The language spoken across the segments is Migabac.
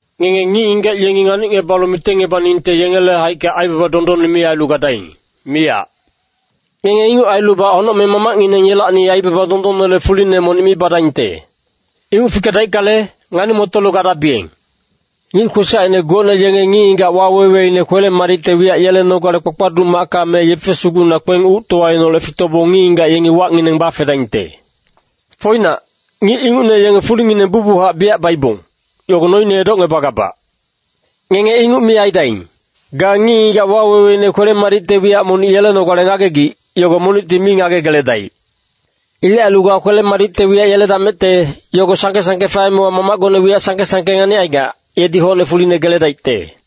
“Ngenge ngic-ngigac yengi nganicngebalu mitengngebaningte yengele haicka aibaba dondonne mi ailu gadaing, miyac. Ngenge inguc ailubac honocmeng Mamacngineng yelacni aibaba dondonnele fuline monic mi badaingte. Inguc fikedaickale, ngani-motolu gadabiyeng. Ngic kwesacine gocne yenge ngic-ngigac waweweine kwele-madicte wiyac yelenogale kpakpaduc macka me yefe sugucna kpeng uctowaineholecti fitobong ngic-ngigac yengi wacngineng bafedaingte. Foinac, ngic ingucne yenge fulingineng bucbuchac biyac baibong, yogo noine edocngebagabac. Ngenge inguc mi aidaing. Ga ngic-ngigac waweweine kwele-madicte wiyac monic yelenogale ngagegic, yogo monicti mi ngagegeledaic. Ilec ailu ga kwele-madicte wiyac yeledamecte, yogo sangke-sangke faemewa Mamacgone wiyac sangke-sangke nganicaigac, yedi hocne fuline geledaicte.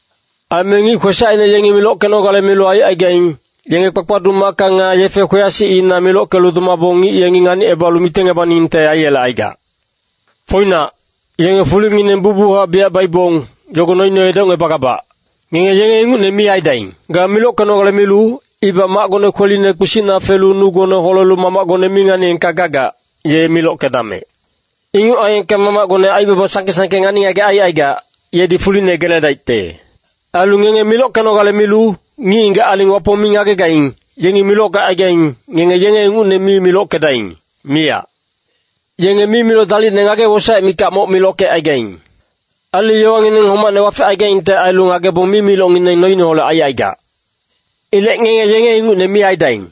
“Aime ngic kwesacine yengi milockenogale milu aicaigaing, yenge kpakpaduc macka nga yefe kweyasicina milockelu domabong ngic yengi nganicebalu mitengebaningte aiyelecaigac. Foinac, yenge fulingineng bucbuchac biyac baibong, yogo noine edocngebagabac. Ngenge yenge ingucne mi aidaing. Ga milockenogale milu, ibac macgone kweline kpisicna felu nugone holelu Mamacgone mi nganiyengka gagac, ye milockedamec. Inguc aiyengka Mamacgone aibaba sangke-sangke ngani-ngagec aicaigac, yedi fuline geledaicte. “Ailu ngenge milockenogale milu, ngic-ngigac aling Wapong mi ngagegaing, yengi milockecaigaing, ngenge yenge ingucne mi milockedaing, miyac. Yenge mimiloc dalicne ngage-wosaec mikac moc milockecaigaing. Ailu yowangineng homacne wafecaigaingte ailu ngagebong mimilocngineng noineholec aicaigac. Ilec ngenge yenge ingucne mi aidaing.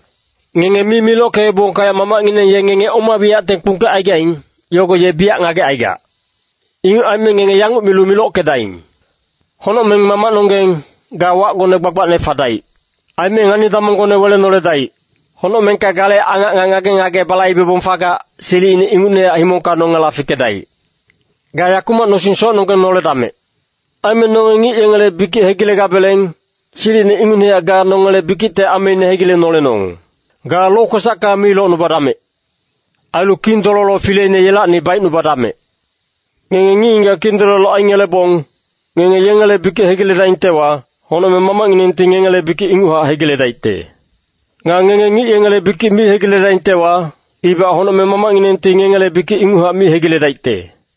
Ngenge mi milockeebongka Mamacngineng ye ngenge oma wiyacte kpungkecaigaing, yogo ye biyac ngagecaigac. “Inguc aime ngenge yanguc milu milockedaing. ‘Honocmeng Mamacnonggeng, ga wacgone gbagbacne fadaic. Aime ngani-damonggone welenoledaic. Honocmengka gale angac nga ngage-ngage balaibebong fagac, silicine ingucnehac himongka nongela fikedaic. Ga yakumac nosing socnonggeng noledamec. Aime nonge ngic yengele bikic hegilegabeleng, silicine ingucnehac ga nongele bikicte ameine hegilenolenong. Ga lokwesacka mi locnubadamec. Ailu Kindololo fileine yelacni baicnubadamec.’ “Ngenge ngic-ngigac kindololo aingelebong, ngenge yengele bikic hegiledaingtewa, honocmeng Mamacnginengti ngengele bikic inguchac hegiledaicte. Nga ngenge ngic yengele bikic mi hegiledaingtewa, ibac honocmeng Mamacnginengti ngengele bikic inguchac mi hegiledaicte.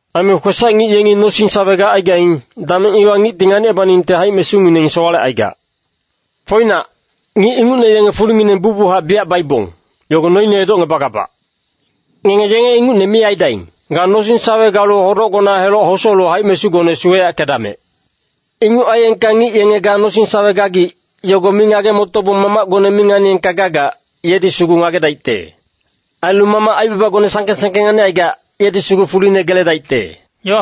“Aime kwesac-ngic yengi nosing-sawe gacaigaing, dameng iwa ngicti nganicebaningte haic-mesungineng sowalecaigac. Foinac, ngic ingucne yenge fulingineng bucbuchac biyac baibong, yogo noine edocngebagabac. Ngenge yenge ingucne mi aidaing. Ga nosing-sawe galu hodocgona heloc hosolu haic-mesugone suweyackedamec. Inguc aiyengka ngic yenge ga nosing-sawe gagic, yogo mi ngage-motobong Mamacgone mi nganiyengka gagac, yedi sugu ngagedaicte. Ailu Mamac aibabagone sangke-sangke nganicaigac, yedi sugu fuline geledaicte.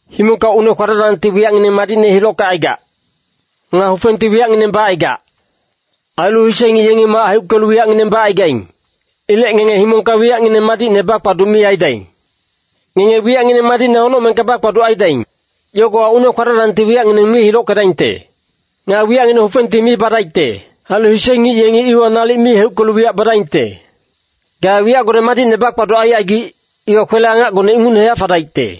“Himongka une-kwadacdangti wiyacngineng madicne hilockecaigac. Nga hufengti wiyacngineng bacaigac. Ailu hise ngic yengi mac heuckelu wiyacngineng bacaigaing. Ilec ngenge himongka wiyacngineng madicne bakpaduc mi aidaing. Ngenge wiyacngineng madicne honocmengka bakpaduc aidaing. Yogowa une-kwadacdangti wiyacngineng mi hilockedaingte. Nga wiyacngineng hufengti mi badaicte. Ailu hise ngic yengi iwa nalic mi heuckelu wiyac badaingte. Ga wiyacgone madicne bakpaduc aicaigic, iwa kwele-angacgone ingucnehac fadaicte.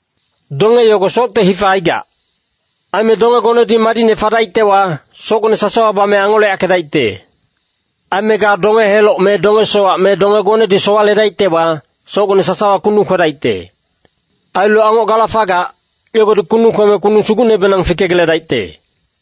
“Donge yogo socte hifa aigac. Aime dongegonedi madicne fadaictewa, socgone sasawa bame angoleyackedaicte. Aime ga donge-heloc me donge-sowac me dongegonedi sowaledaictewa, socgone sasawa kundung kwedaicte. Ailu angoc gala fagac, yogodi kundung kweme kundung sugucnebenang fikegeledaicte.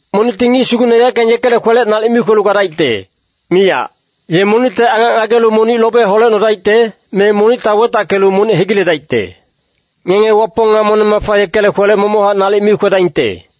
“Monicti ngic sugucne yaeckang yekele kwelec nalic mi kwelu gadaicte, miyac. Ye monicte angac ngagelu monic lobe holecnodaicte, me monicta wetackelu monic hegiledaicte. Ngenge Wapong nga moneng-mafa yekele kwelec momochac nalic mi kwedaingte.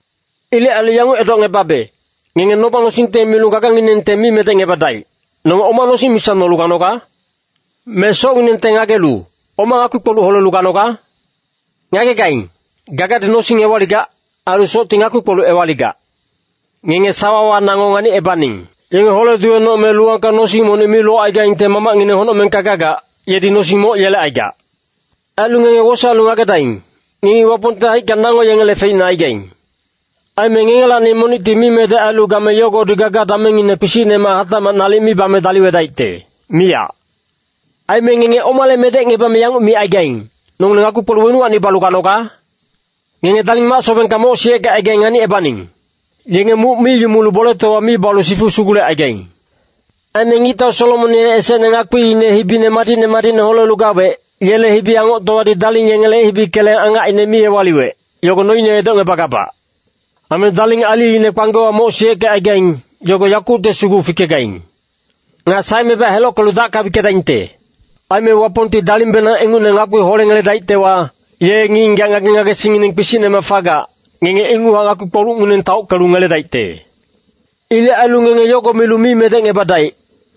“Ilec ailu yanguc edocngebabe, ngenge noba-nosingte milu gaganginengte mi medecngebadaic, ‘Nonge oma nosing misa nolu ganoga?’ Me socnginengte ngagelu, ‘Oma ngakpi-kpoluc holelu ganoga?’ Ngagegaing, gagadi nosing ewaligac, ailu socti ngakpi-kpoluc ewaligac. Ngenge sawawa nango nganicebaning. Yenge hole-duwenoc me luwangka nosing monic mi locaigaingte Mamacngineng honocmengka gagac, yedi nosing moc yelecaigac. Ailu ngenge wosaelu ngagedaing, ngengi Wapongte haicka nango yengele feicne aigaing. Aime ngengelacni monicti mimedec ailu game yogodi gaga-damengngine kpisicnemac hatacmac nalic mi bame daliwedaicte, miyac. “Aime ngenge omale medecngebame yanguc micaigaing, ‘Nongileng ngakpi-kpoluc wenuwacni balu ganoga?’ Ngenge daling mac-sobengka moc siyeckecaigaing nganicebaning. Yenge muc mi yumulu boletowa mi balu sifu sugulecaigaing. Aime ngictau Solomon ye esecne ngakpiine hibine madicne madicne holelu gawec, yele hibi-angoctowadi daling yengele hibi keleng angacine mi ewaliwec, yogo noine edocngebagabac. Aime daling aliine kpanggewa moc siyeckecaigaing, yogo yakucte sugu fikegaing. Nga saemebac helockelu dacka wickedaingte. Aime Wapongti dalingbenang ingucne ngakpi holeyeledaictewa, ye ngic-ngigac ngage-ngagesingngineng kpisicnemac fagac, ngenge inguchac ngakpi-kpolucngineng taockelu ngeledaicte. “Ilec ailu ngenge yogo milu mi medecngebadaic,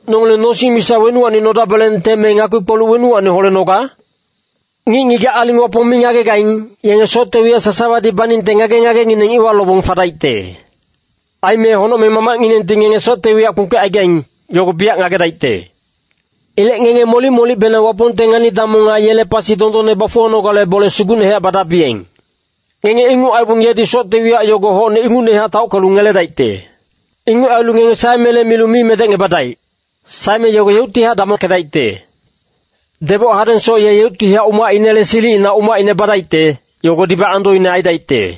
‘Nongileng nosing misa wenuwacni nodabelengte me ngakpi-kpoluc wenuwacni holenoga?’ Ngic-ngigac aling Wapong mi ngagegaing, yenge socte wiyac sasawadi baningte ngage-ngagengineng iwa lobong fadaicte. Aime Honocmeng Mamacnginengti ngenge socte wiyac kpungkecaigaing, yogo biyac ngagedaicte. Ilec ngenge molic-molicbenang Wapongte ngani-damong nga yele pasi dondonne bafuwanogale bole sugucnehac badabiyeng. Ngenge inguc aibong yedi socte wiyac yogo hocne ingucnehac taockelu ngeledaicte. Inguc ailu ngenge saemele milu mi medecngebadaic. Saeme yogo yeuctihac damongkedaicte. Deboc hadengsoc ye yeuctihac umacinele silicina umacine badaicte, yogodibac andoine aidaicte.”